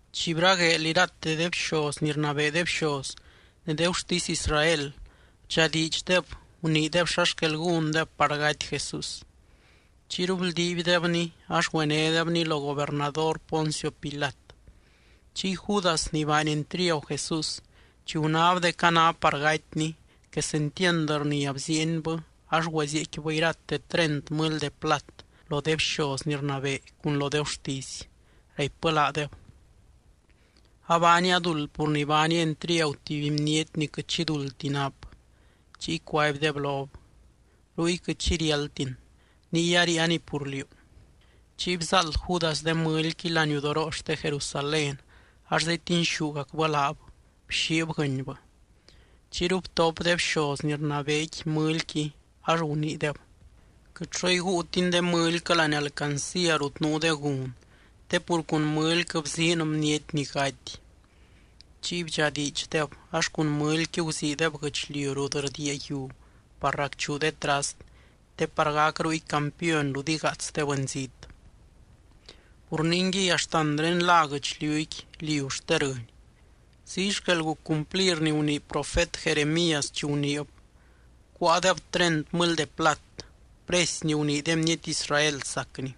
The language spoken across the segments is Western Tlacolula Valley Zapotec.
Chi bragueel, irate de bxoz ni rnabee de bxoz ne de gurtisy Israel bdxadiidxdeb, guniideb xa xquel gúndeb par gaty Jesús. Chiyru bldiibdebny ax güenédebny lo gobernador Poncio Pilat. Chiy Judas ni baany entriagu Jesús, chi gunáb dec a ná par gatyny, quesentiand rnia bziienbɨ ax güezieecquibɨ irate treint mɨly de plat lo de bxoz ni rnabee cun lo de gurtisy, raipbɨ laadeb: —Abaania duld pur ni baania entriagu tuby bniety ni quɨt xi duldti nap. Chiy cuaibdeb lob: —Ruy quɨt xi riáldtin, ¡niy aríianiy pur liú! Chiy bzáald Judas de mɨlyqui laniudoroo xte Jerusalén ax zetinxúgacbɨ laab, bxiib guɨnybɨ. Chiyru btop de bxoz ni rnabeequi mɨlyqui, ax guniideb: —Quɨt xo iguutin de mɨlyquɨ láani alcancía rut nuu de gun, te pur cun mɨlyquɨ bziin bniety ni gaty. Chiy bdxadiidxdeb ax cun mɨlyqui guziideb guɨchliu rut rdiia yiu par racchuu de trast, te par gac ruy campiony rut igaats de bɨnzít. Pur ningui, axtanré lá guɨchliuqui, Liu xte Rɨny. Ziy xquel guc cumplir ni gunii profet Jeremías, chi guniib: “Cuáadeb treint mɨly de plat, precy ni gunii de bniety Israel sacny.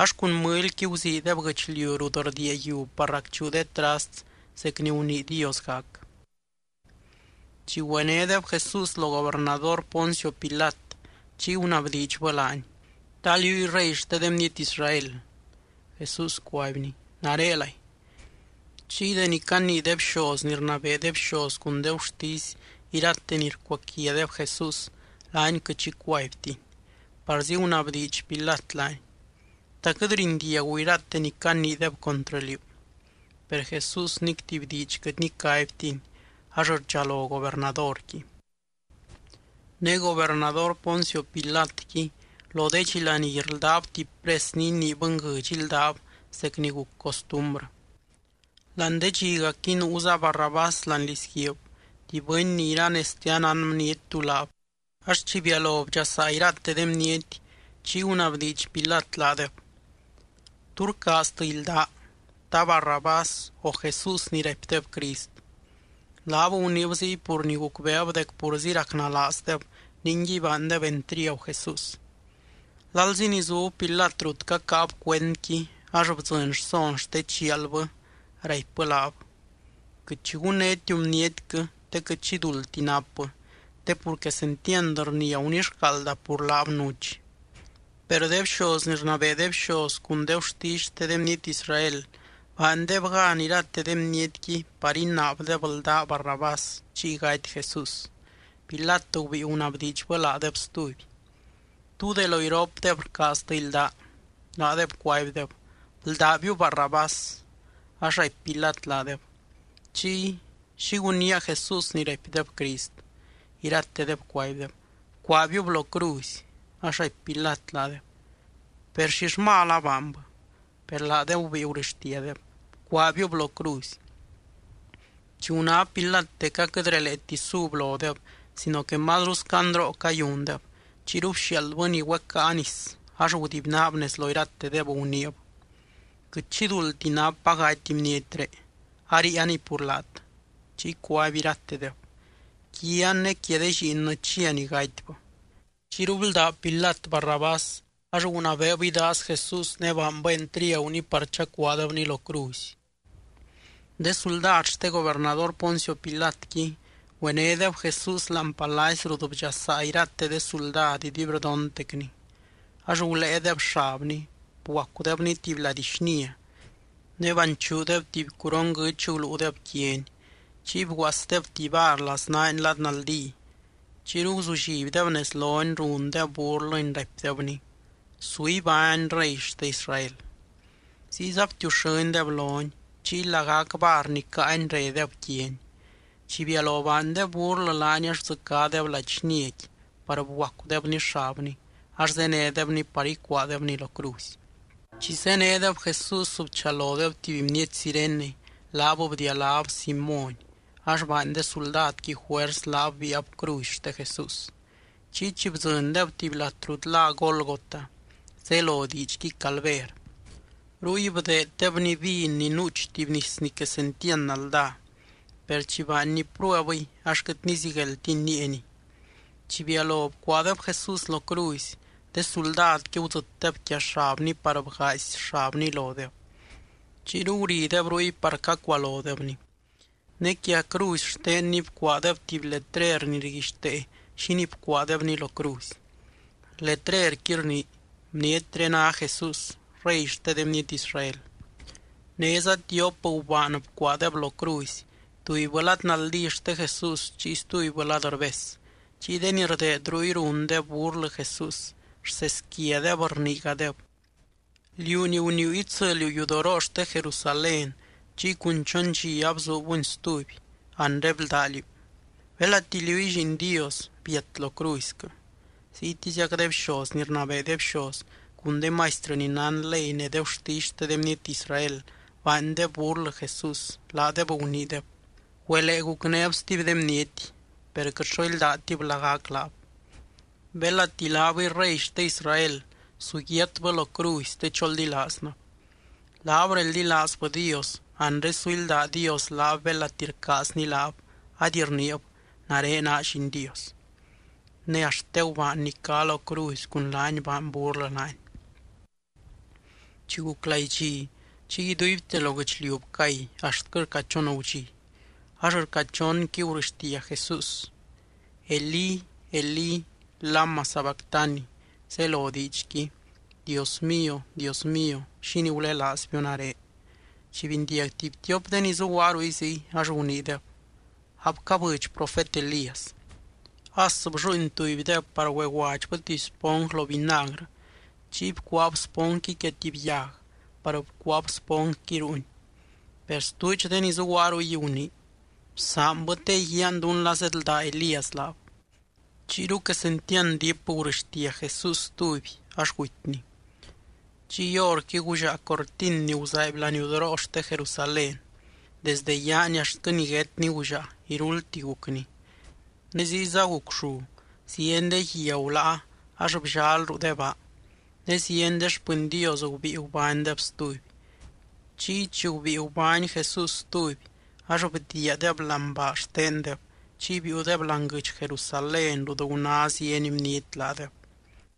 Ax cun mɨlyqui guziideb guɨchliu rut rdiia yiu par racchuu de trast, zec ni gunii Dios gac.” Chi güenédeb Jesús lo gobernador Poncio Pilat, chiy gunabdiidxbɨ laany: —¿Ta liúy rey xte de bniety Israel? Jesús cuaibny: —Narelay. Chiy deni canii de bxoz ni rnabee de bxoz cun de gurtisy irate ni rcuaquiadeb Jesús, laany quɨt xi cuaibtiny. Parzi gunabdiidx Pilat laany: —¿Ta quɨt rindiagu irate ni caniideb contrɨ liú? Per Jesús nic tuby diidx quɨt nicaibtiny, ax rdxalo gobernadorqui. Ne gobernador Poncio Pilatqui lo de dxi laní rldáb tuby pres ni inii bɨnguɨdx íldab zec ni guc costumbrɨ. Láani de dxigacqui nuuza Barrabás láani lizguiib, tuby bɨny ni iranezte anán bniety tú laab. Ax chi bialo bdxasaa irate de bniety, chiy gunabdiidx Pilat laadeb: —¿Tú rcaaztɨ ildaa? ¿Ta Barrabás, o Jesús ni raipdeb Crist? Laab guniib ziy pur ni gucbeeb dec purzi racnalaazdeb ningui baandeb entriagu Jesús. Lalzi ni zub Pilat rut cacáab cuendqui, ax bdzɨny rson xte chialbɨ, raipbɨ laab: “Quɨt xi gunnétiu bnietquɨ te quɨt xi duldti napbɨ, te pur quesentiand rnia gunixcaalda pur laab nuch.” Per de bxoz ni rnabee de bxoz cun de gurtisy xte de bniety Israel baandeb gan irate de bnietqui par inaabdeb ldá Barrabás, chiy gaty Jesús. Pilat gubíi gunabdiidxbɨ laadeb stuby: —¿Tú de lo iropdeb rcaaztɨ ildaa? Laadeb cuaibdeb: —Bldábiu Barrabás. Ax raipy Pilat laadeb: —Chiy, ¿xi gunnía Jesús ni raipdeb Crist? Iratedeb cuaibdeb: —¡Bcuaabiub lo cruzy! Ax raipy Pilat laadeb: —Per, ¿xill mal abaanbɨ? Per laadeb gubíi gurɨxtiadeb: —¡Bcuaabiub lo cruzy! Chi guná Pilat dec aquɨt releeti sub lodeb, sino que mazru scandroo cayundeb, chiyru bxiaaldbɨ ni güecáa nis ax gudibynaab nez lo iratedeb, guniib: —Quɨt xi duldti napa gaty bnietré, aríianiy pur laat. Chiy cuaby iratedeb: —¡Quian ne quia de lliinnɨ chia ni gatybɨ! Chiyru bldá Pilat Barrabás, ax gunabeeb idaaz Jesús ne baanbɨ entriaguny par chacuaadebny lo cruzy. De suldad xte gobernador Poncio Pilatqui güenédeb Jesús láani palacy rut bdxasaa irate de suldad iduibrdontecny. Ax guléedeb xabny, bguacudebny tuby lady xnia. Ne banchuudeb tuby curon guɨ́ch guluudeb quiany, chiy bguaasdeb tuby var laznaany lad naldí. Chiyru guzullibdeb nez lony, rundeb burlɨny, raipdebny: —¡Su ibány Rey xte Israel! Ziyza btiuxɨ́ndeb lony, chiy lagac var ni caany redeb quiany. Chi bialo baandeb burlɨ laany ax bdzɨcádeb lady xniaqui par bguacudebny xabny, ax zénedebny par icuaadebny lo cruzy. Chi zénedeb Jesús bchalodeb tuby bniety Cirene, laab bdialáb Simóny, ax baany de suldadqui juers laab biaab cruzy xte Jesús. Chiy chi bdzɨndeb tuby lat rut lá Gólgota, zelo diidxqui Calver, ruy bdeedebny vin ni nuuch tuby nis ni quesentiand naldá. Per chi baanny pruebɨy, ax quɨt nizigueldtiny níieniy. Chi bialo bcuaadeb Jesús lo cruzy, de suldadqui gudzɨtdeb quia xabny par bgaazy xabny lodeb. Chiyru gurideb ruy par cacualodebny. Ne quia cruzy xtenny bcuaadeb tuby letrer ni rguixtee xínii bcuaadebny lo cruzy. Letrequi rnii: BNIETRÉ NÁ JESÚS, REY XTE DE BNIETY ISRAEL. Néza tiop gubaan bcuaadeb lo cruzy, tubybɨ lad naldí xte Jesús chiy stubybɨ lad rbes. Chiy de ni rdeed ruy rundeb burlɨ Jesús, rseesquiadeb, rniigadeb: —Liú ni guniiu itsɨliu yudoroo xte Jerusalén chiy cun chon dxi abzuubuni stuby, anre bldá liú. Belati liúy Lliin Dios, biat lo cruzyquɨ. Ziytiziac de bxoz ni rnabee de bxoz cun de maistrɨ ni nán ley ne de gurtisy xte de bniety Israel, baandeb burlɨ Jesús, laadeb guniideb: —Güelee gucnéb stuby de bniety, per quɨt xo íldatib lagac laab. Belati laabɨy Rey xte Israel, su yiatbɨ lo cruzy te choldilaaznɨb. Laab reldilaazbɨ Dios, anre su ílda Dios laab belati rcaazny laab, ady rniib: “Nare naa Lliin Dios.” Ne axt de gubaan ni cá lo cruzy cun laany baany burlɨ laany. Chi guc laidxi, chiy iduibte lo guɨchliu bcay, axtquɨ rca chon gudxi. Ax rca chonqui gurɨxtia Jesús: —Elí, Elí, ¿lama sabactani? —zelo diidxqui: Dios mío, Dios mío, ¿xínii gulelaazbiu nare? Chi bindiag tuby tiop de ni zuguaa ruy ziy, ax guniideb: —Abcabɨdx profet Elías. As blluuin tubydeb par güeguadxbɨ tuby sponj lo vinagrɨ. Chiy bcuaab sponjqui quia tuby yag par bcuaab sponjqui ruuny. Per stuudx de ni zuguaa ruy gunii: —Bsaanbɨ, te iguiaan dún la zeedldá Elías laab. Chiyru quesentiand diip gurɨxtia Jesús stuby, ax gutyny. Chiy horqui gullaa cortin ni guzaaiby laniudoroo xte Jerusalén, desde yaani axtquɨ niguétni gullaa, iruldti gucni. Ne ziyza guc llu, zieny de guia guláa ax bllal ruu de baa. Ne zieny de xpɨny Dios gubíi gubánydeb stuby. Chiy chi gubíi gubány Jesús stuby, ax bdiiadeb láani baa xtendeb, chiy biiudeb láani guɨdx Jerusalén rut guná zieny bniety laadeb.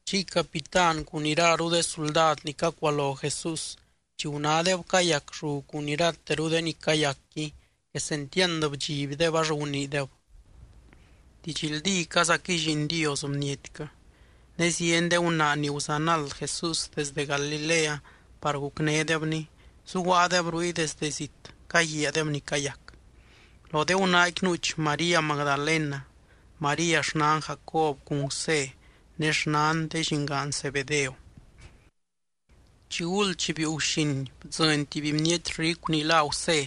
Chiy capitán cun iraru de suldad ni cacualo Jesús, chi gunádeb cayac llu cun irateru de ni cayacqui, quesentiand bdxibdeb ax guniideb: —Didxldícazaquɨy Lliin Dios bnietquɨ. Ne zieny de gunaa ni guzanald Jesús desde Galilea par gucnédebny, zuguaadeb ruy desdɨ zit caguiaadeb ni cayac. Lo de gunaaqui nuuch María Magdalena, María xnan Jacob cun Gusé, ne xnan de llingaan Zebedeo. Chiguld chi biiu guxin bdzɨny tuby bniety ricu ni lá Gusé,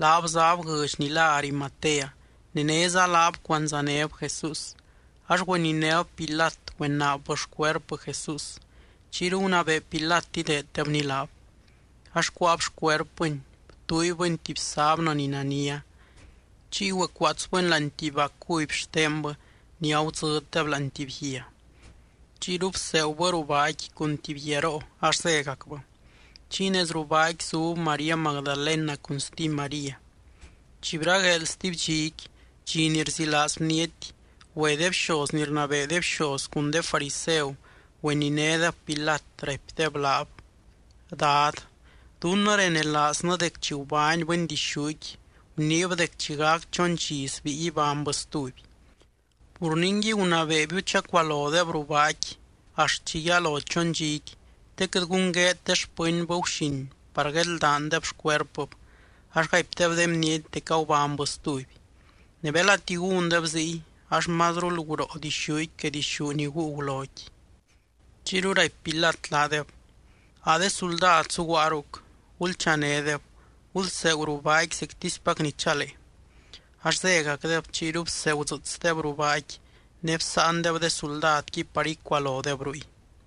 laab záb guɨdx ni lá Arimatea, ne néza laab cuandzanéb Jesús. Ax güeninéb Pilat, güenaabbɨ xcuerpɨ Jesús. Chiyru gunabee Pilat ideeddebny laab. Ax cuáab xcuerpɨny, btuuibɨny tuby sábnɨ ni nania. Chiy güecuaatsbɨny láani tuby baa cuby xtenbɨ ni agudzɨddeb láani tuby guia. Chiyru bseegubɨ ruu baaqui cun tuby guiaroo ax zégacbɨ. Chiy nez ruu baaqui zub María Magdalena cun stuby María. Chi bragueel stuby dxiqui, dxi ni rzilaaz bniety, güe de bxoz ni rnabee de bxoz cun de fariseu, güeninédeb Pilat, raipdeb laab: —Dad, dunnɨ renelaaznɨ dec chi gubány bɨndixúqui guniib dec chi gac chon dxi sbíi ibánybɨ stuby. Pur ningui, gunabeebiu chacualodeb ruu baaqui axt chi yalo chon dxiqui te quɨt gun gueed de xpɨnbɨ guxin par guedldaandeb xcuerpɨb, ax gaipdeb de bniety dec agubánybɨ stuby. Ne belati gúndeb ziy, ax mazrul guroo dixúqui que dixú ni guu guloqui. Chiyru raipy Pilat laadeb: —A de suldad zuguaa ruc. Gulchanédeb, gulseegu ruu baaqui zectispac ni chalee. Ax zégacdeb, chiyru bsegudzɨɨtsdeb ruu baaqui. Ne bsáandeb de suldadqui par icualodeb ruy.